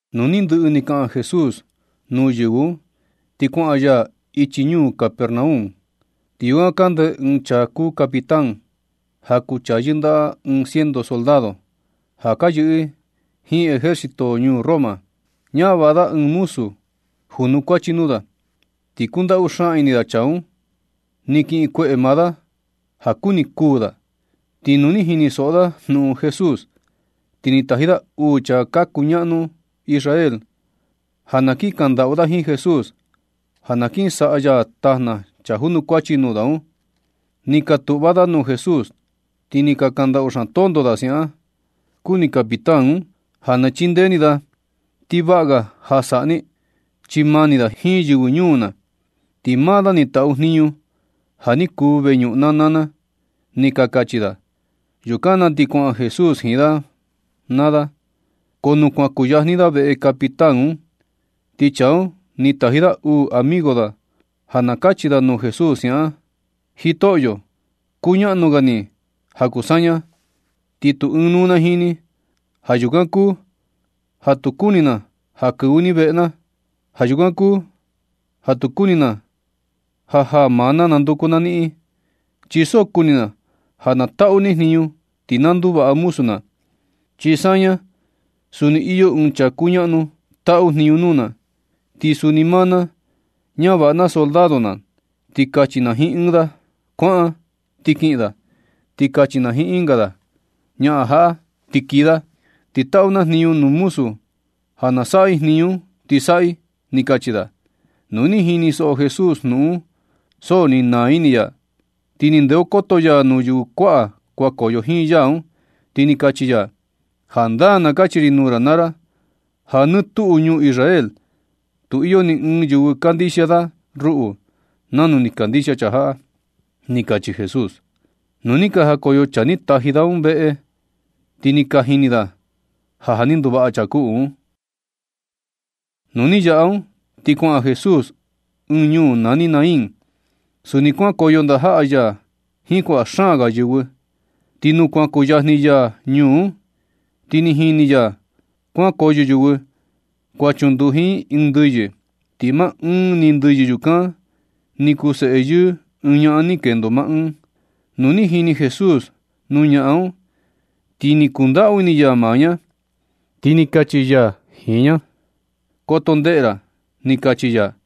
Nu ni ndɨꞌɨ ni kaꞌan Jesús nuu yɨvɨ un, ti kuaꞌan ya ichi ñuu Capernaum. Ti yukan kande ɨɨn chaa kuu capitán, ja kuu chaa yɨndaꞌa ɨɨn ciento soldado, ja ka yɨꞌɨ i jiin ejército ñuu Roma. Ñavaꞌa da ɨɨn muzu junukuachi nuu da, ti kundaꞌu xaan ini da chaa un. Ni kiꞌin kueꞌe maa da ja kuni kuu da. Ti nu ni jinisoꞌo da jnuꞌun Jesús, ti ni taji da uu chaa ka kuñaꞌnu Israel, ja na kiꞌin kandaꞌu da jiin Jesús, ja na kin saꞌa ya tajna chaa junukuachi nuu da un. Ni ka tuꞌva da nuu Jesús, ti ni ka kandaꞌu xaan tonto da siaꞌan: ―Kuni capitán un ja na chindee ni da, ti vaꞌa ga ja na saꞌa ni, chi mani da jiin yɨvɨ ñuu na. Ti maa da ni taꞌu jniñu ja ni kuu veñuꞌun na naa na ―ni ka kachi da. Yukan na ti kuaꞌan Jesús jiin da naa da. Ko nu kuan kuyajni ya veꞌe capitán un, ti chaa un ni taji da uu amigo da ja na kachi da nuu Jesús siaꞌan: ―Jitoꞌyo, kuñaꞌnu ga ni ja kuu saña, ti tu ɨɨn nuu na jiin ni. Ja yukan kuu ja tu kuni na ja kɨvɨ ni veꞌe na. Ja yukan kuu ja tu ni kuni na ja jaa maa na ja nanduku na niꞌin. Chi so kuni na ja na taꞌu ni jniñu ti na nduvaꞌa muzu na. Chi saña suni iyo ɨɨn chaa kuñaꞌnu taꞌu jniñu nuu na, ti suni maa na ñavaꞌa na soldado na. Ti kachi na jiin ɨɨn da “kuaꞌan”, ti kiꞌin da. Ti kachi na jiin ɨnga “ñaꞌan jaꞌa”, ti kii da. Ti taꞌu na jniñu nuu muzu ja na saꞌa i jniñu un, ti saꞌa i ―ni kachi da. Nu ni jinisoꞌo Jesús jnuꞌun un, so ni naa ini ya. Ti ni ndeokoto ya nuu yɨvɨ kuaꞌa kuankoyo jiin ya un, ti ni kachi ya: ―Jandaa na kachi ri nuu ra naa ra ja nɨ tuꞌu ñuu Israel tu iyo ni ɨɨn yɨvɨ kandixia da ruꞌu nanu ni kandixia chaa jaꞌa ―ni kachi Jesús. Nu ni ka najakoyo chaa ni taji da un veꞌe, ti ni ka jini da ja, ja ni nduvaꞌa chaa kuꞌu un. Nu ni yaꞌa un, ti kuaꞌan Jesús ɨɨn ñuu nani Naín. Suni kuankoyo ndajaꞌa ya jiin kuaꞌa xaan ga yɨvɨ. Ti nu kuan kuyajni ya ñuu un, ti ni jini ya kuankoyo yɨvɨ kuan chunduji i ɨɨn ndɨyɨ, ti maa ɨɨn ni ndɨyɨ yukan ni kuu seꞌe yɨɨ ɨɨn ñaꞌan ni kendo maa ɨɨn. Nu ni jini Jesús nuu ñaꞌan un, ti ni kundaꞌu ini ya maa ña, ti ni kachi ya jiin ña: ―Koto ndeꞌe ra ―ni kachi ya.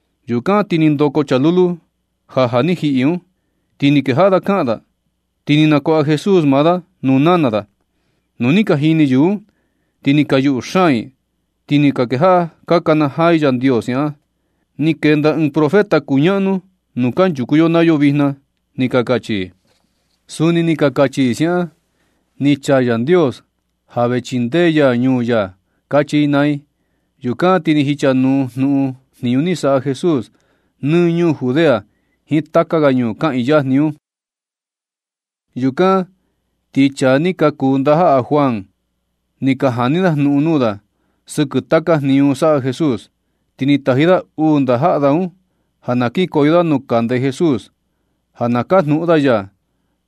Yukan ti ni ndoko chaa lulu ja ja ni jiꞌi un, ti ni kejaꞌa da kaꞌan da, ti ni nakuaꞌa Jesús maa da nuu nana da. Nu ni ka jini yɨvɨ un, ti ni ka yuꞌu xaan i, ti ni ka kejaꞌa ka nakanajaa i Yandios siaꞌan: ―Ni kenda ɨɨn profeta kuñaꞌnu nuu kanchuku yo naa yo vijna ―ni ka kachi i. Suni ni ka kachi i siaꞌan: ―Ni chaa Yandios ja vee chindee ya ñuu ya ―kachi i naa i. Yukan ti ni jichanuu jnuꞌun jniñu ni saꞌa Jesús nɨ ñuu Judea jiin taka ga ñuu kaꞌiin yajni un. Yukan ti chaa ni ka kuu ndajaꞌa Juan, ni ka jani da jnuꞌun nuu da sɨkɨ taka jniñu saꞌa Jesús. Ti ni taji da uu ndajaꞌa da un ja na kinkoyo da nuu kande Jesús, ja na kajnuꞌun da ya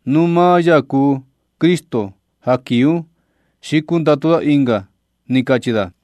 nu maa ya kuu Cristo ja kii un, xi kundatu da ɨnga, ni kachi da.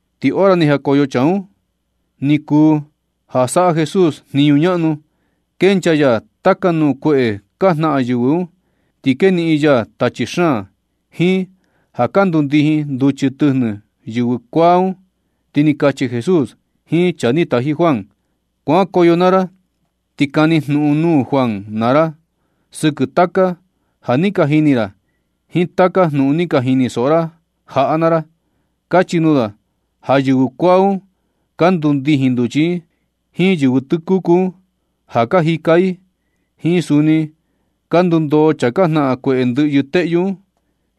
Ti hora ni jakoyo chaa un, ni kuu ja saꞌa Jesús jniñu ñaꞌnu kenchaa ya taka nuu kueꞌe ka jnaꞌan yɨvɨ un, ti keniꞌin ya tachi xaan, jiin ja ka ndundijin nduchi tɨjnɨ yɨvɨ kuaa un. Ti ni kachi Jesús jiin chaa ni taji Juan: ―Kuankoyo naa ra ti kani jnuꞌun nuu Juan naa ra sɨkɨ taka ja ni ka jini ra jiin taka jnuꞌun ni ka jinisoꞌo ra jaꞌa naa ra. Kachi nuu da ja yɨvɨ kuaa un ka ndundijin nduchi i, jiin yɨvɨ tɨkuku un ja ka jika i, jiin suni ka ndundoo chaa ka jnaꞌan kueꞌe ndɨꞌyɨ teꞌyu un,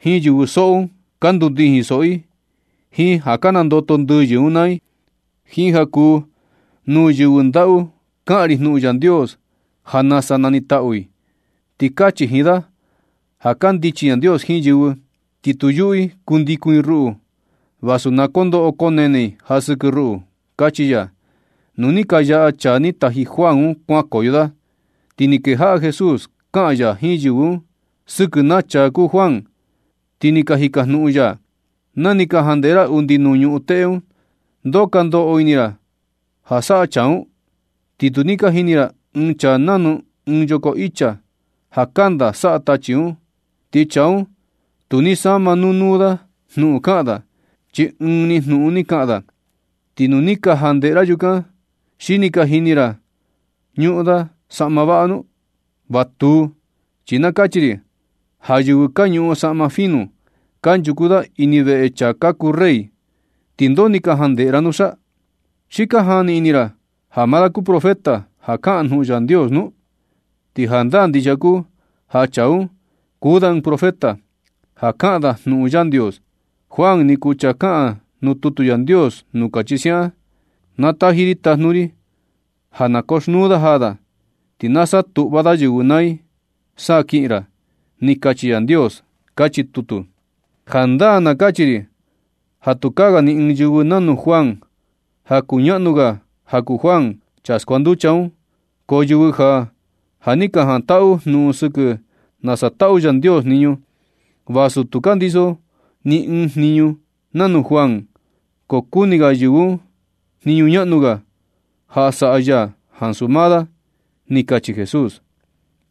jiin yɨvɨ soꞌo un ka ndundijin soꞌo i jiin ja ka nandoto ndɨyɨ un naa i, jiin ja kuu nuu yɨvɨ ndaꞌu kaꞌan ri jnuꞌun Yandios ja nasa nanitaꞌu i. Ti kachi jiin da ja kandichi Yandios jiin yɨvɨ, ti tu yuꞌu i kundikun i ruꞌu vasu na kondoꞌo koo nene i ja sɨkɨ ruꞌu ―kachi ya. Nu ni ka yaꞌa chaa ni taji Juan un kuankoyo da, ti ni kejaꞌa Jesús kaꞌan ya jiin yɨvɨ un sɨkɨ naa chaa kuu Juan, ti ni jikajnuꞌun ya: ―Na ni ka jandeꞌe ra undi nuu ñuꞌun teꞌe un, ¿Ndoo ka ndoꞌo ini ra ja saꞌa chaa un? Ti tu ni ka jini ra ɨɨn chaa nanu ɨɨn yoko icha ja kanda saꞌa tachi un, ti chaa un tu ni sama nuu nuu da jnuꞌun kaꞌan da, chi ɨɨn ni jnuꞌun ni kaꞌan da. Ti nu ni ka jandeꞌe ra yukan, ¿xi ni ka jini ra ja ñuꞌun da saꞌma vaꞌa nu? Va tuu, chi na kachi ri ja yɨvɨ ka ñuꞌun saꞌma fino kanchuku da ini veꞌe chaa ka kuu rey. ¿Ti ndoo ni ka jandeꞌe ra nusa? ¿Xi ka jani ini ra ja maa da kuu profeta ja kaꞌan jnuꞌun Yandios nu? Ti jandaa ndixia kuu ja chaa un, kuu da ɨɨn profeta ja kaꞌan da jnuꞌun Yandios. Juan ni kuu chaa kaꞌan nuu tutu Yandios nuu kachi siaꞌan: Na taji ri tajnu ri ja na koxnuu da jaa da. Ti na satuꞌva da yɨvɨ naa i sa kiꞌin ra. Ni kachi Yandios, kachi tutu. Jandaa na kachi ri ja tukaa ga ni ɨɨn yɨvɨ nanu Juan ja kuñaꞌnu ga ja kuu Juan chaa skuanducha un. Ko yɨvɨ ja, ja ni ka jantaꞌu jnuꞌun sɨkɨ nasa taꞌu Yandios jniñu, vasu tu ka ndiso ni ɨɨn jniñu nanu Juan, ko kuni ga yɨvɨ un jniñu ñaꞌnu ga ja saꞌa ya ansu maa da ―ni kachi Jesús.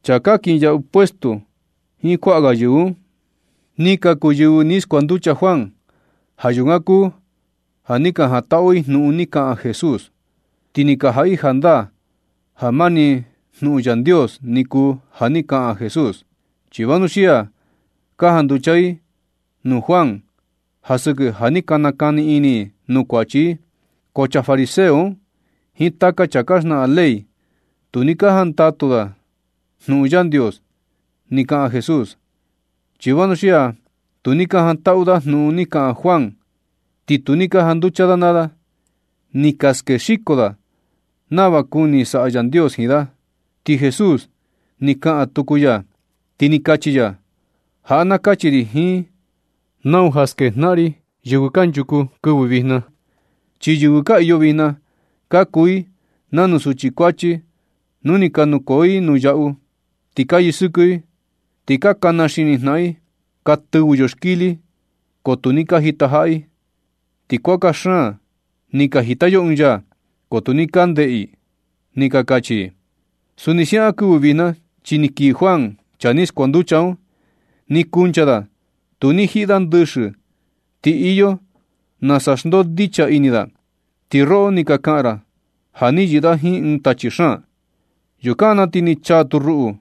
Chaa ka kinyaꞌu puesto jiin kuaꞌa ga yɨvɨ un, ni ka kuu yɨvɨ ni skuanducha Juan. Ja yukan kuu ja ni ka jantaꞌu i jnuꞌun ni kaꞌan Jesús, ti ni ka jaꞌa i jandaa ja mani jnuꞌun Yandios ni kuu ja ni kaꞌan Jesús, chi vanuxia ni ka janducha i nuu Juan ja sɨkɨ ja ni ka nakani ini i nuu kuachi i. Ko chaa fariseo un jiin taka chaa ka xnaꞌan ley, tu ni ka jantaꞌu da jnuꞌun Yandios ni kaꞌan Jesús, chi vanuxia tu ni ka jantaꞌu da jnuꞌun ni kaꞌan Juan ni tu ni ka janducha da naa da. Ni ka skexiko da nava kuni saꞌa Yandios jiin da. Ti Jesús ni kaꞌan tuku ya, ti ni kachi ya: ―Jaꞌa na kachi ri jiin nau ja skejnaꞌan ri yɨvɨ kanchuku kɨvɨ vijna. Chi yɨvɨ ka iyo vijna ka kuu i nanu suchi kuachi nu ni ka nukoo i nuu yaꞌu ti ka yɨsɨkɨ i, ti ka kana xini jnaꞌan i: “Ka tɨvɨ yo xkili, ko tu ni ka jitajaꞌa i. Ti kuaka xaan ni ka jita yo ɨɨn yaa, ko tu ni ka ndeꞌe i”, ni ka kachi i. Suni siaꞌan kɨvɨ vijna, chi ni kii Juan, chaa ni skuanducha un, ni kuncha da. Tu ni jiꞌi da ndɨxɨ, ti iyo nasa xndondicha da ini da. Ti roꞌo ni ka kaꞌan ra ja ni yɨꞌɨ da jiin ɨɨn tachi xaan. Yukan na ti ni chaa tu ruꞌu,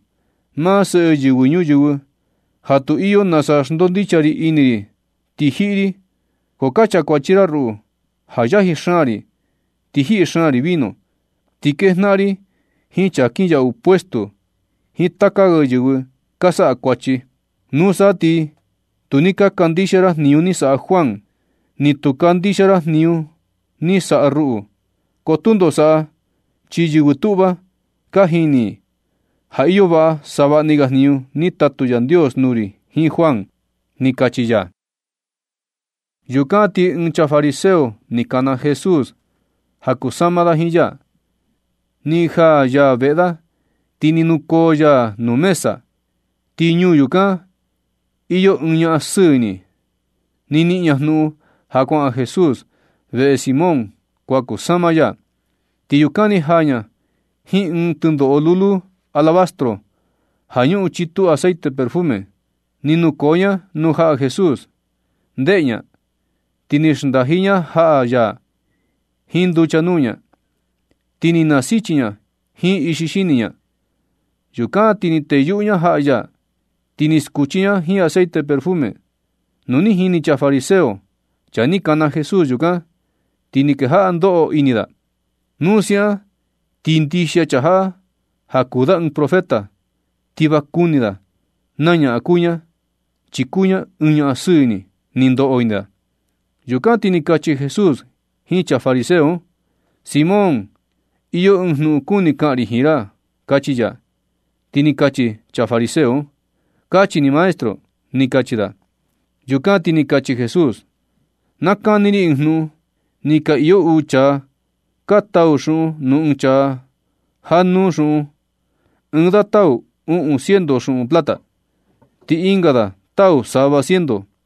maa Seꞌe Yɨvɨ Ñuyɨvɨ ja tu iyo nasa xndondicha ri ini ri, ti jiꞌi ri. Ko ka chakuachi ra ruꞌu ja yaji xaan ri, ti jiꞌi xaan ri vino, ti kejnaꞌan ri jiin chaa ka kinyaꞌu nuu puesto jiin taka ga yɨvɨ ka saꞌa kuachi. Nusa ti tu ni ka kandixia ra jniñu ni saꞌa Juan, ni tu ka kandixia ra jniñu ni saꞌa ruꞌu. Ko tundo saꞌa, chi yɨvɨ tuꞌva ka jini i ja iyo vaꞌa savaꞌni ga jniñu ni tatu Yandios nuu ri jiin Juan ―ni kachi ya. Yukan ti ɨɨn chaa fariseo ni kana Jesús ja kusama da jiin ya. Ni jaa ya veꞌe da, ti ni nukoo ya nuu mesa. Ti ñuu yukan iyo ɨɨn ñaꞌan sɨɨ ini. Ni niꞌin ña jnuꞌun ja kuaꞌan Jesús veꞌe Simón kuan kusama ya, ti yukan ni jaa ña jiin ɨɨn tɨndoꞌo lulu alabastro ja ñuꞌun chitu aceite perfume. Ni nukoo ña nuu jaꞌa Jesús, ndeꞌe ña, ti ni xndaji ña jaꞌa ya jiin nducha nuu ña, ti ni nasichi ña jiin ixi xini ña. Yukan ti ni teyuꞌu ña jaꞌa ya, ti ni skuchi ña jiin aceite perfume un. Nu ni jini chaa fariseo, chaa ni kana Jesús yukan, ti ni kejaꞌa ndoꞌo ini da: “Nu siaꞌan ti ndixia chaa jaꞌa ja kuu da ɨɨn profeta, ti va kuni da naa ñaꞌan kuu ña, chi kuu ña ɨɨn ñaꞌan sɨɨ ini”, ni ndoꞌo ini da. Yukan ti ni kachi Jesús jiin chaa fariseo un: ―Simón, iyo ɨɨn jnuꞌun kuni kaꞌan ri jiin ra ―kachi ya. Ti ni kachi chaa fariseo un: ―Kachi ni maestro ―ni kachi da. Yukan ti ni kachi Jesús: ―Na kani ri ɨɨn jnuꞌun. Ni ka iyo uu chaa ka tau xuꞌun nuu ɨɨn chaa jaꞌa nuu xuꞌun. Ɨɨn da tau uꞌun ciento xuꞌun plata, ti ɨnga da tau sava ciento.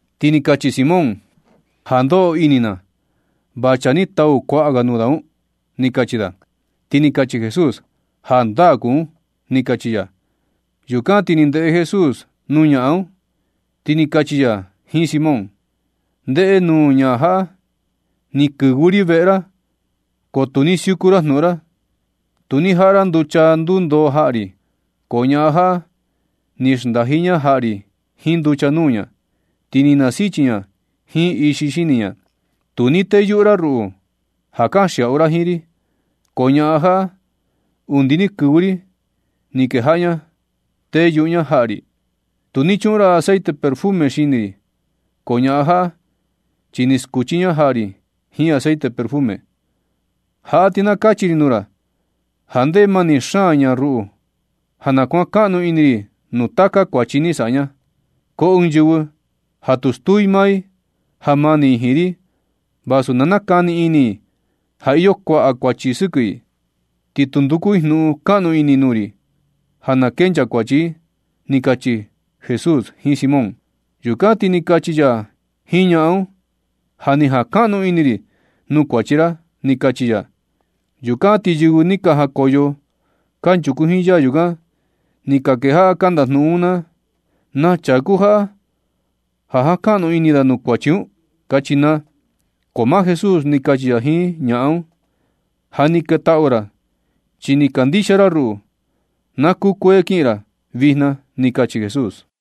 Ti ni kachi Simón: ―Ja ndoꞌo ini na va chaa ni tau kuaꞌa ga nuu da un ―ni kachi da. Ti ni kachi Jesús: ―Jandaa kuu un ―ni kachi ya. Yukan ti ni ndeꞌe Jesús nuu ñaꞌan un, ti ni kachi ya jiin Simón: ―Ndeꞌe nuu ñaꞌan jaꞌa. Ni kɨvɨ ri veꞌe ra ko tu ni siuku ra jnuꞌun ra. Tu ni jaꞌa ra nducha ndundoo jaꞌa ri. Ko ñaꞌan jaꞌa ni xndaji ña jaꞌa ri jiin nducha nuu ña, ti ni nasichi ña jiin ixi xini ña. Tu ni teyuꞌu ra ruꞌu ja kanxiaꞌu ra jiin ri, ko ñaꞌan jaꞌa, undi ni kɨvɨ ri ni kejaꞌa ña teyuꞌu ña jaꞌa ri. Tu ni chuꞌun ra aceite perfume xini ri, ko ñaꞌan jaꞌa, chi ni skuchi ña jaꞌa ri jiin aceite perfume. Jaꞌa ti na kachi ri nuu ra ja ndeꞌe mani xaan ña ruꞌu ja na kuankaꞌnu ini ri nuu taka kuachi ni saꞌa ña. Ko ɨɨn yɨvɨ ja tu stuu i maa i ja mani i jiin ri va tu nakani ini i ja iyo kuaꞌa kuachi sɨkɨ i, ni tu nduku i jnuꞌun kaꞌnu ini nuu ri ja na kenchaa kuachi i ―ni kachi Jesús jiin Simón. Yukan ti ni kachi ya jiin ñaꞌan un: ―Ja ni jankaꞌnu ini ri nuu kuachi ra ―ni kachi ya. Yukan na ti yɨvɨ ni ka jakoyo kanchuku jiin ya yukan, ni ka kejaꞌa ka ndajnuꞌun naa: ―¿Naa chaa kuu chaa jaꞌa ja jankaꞌnu ini da nuu kuachi un? ―kachi naa. Ko maa Jesús ni kachi ya jiin ñaꞌan un: ―Ja ni ketaꞌu ra, chi ni kandixia ra ruꞌu. Na kukuee kiꞌin ra vijna ―ni kachi Jesús.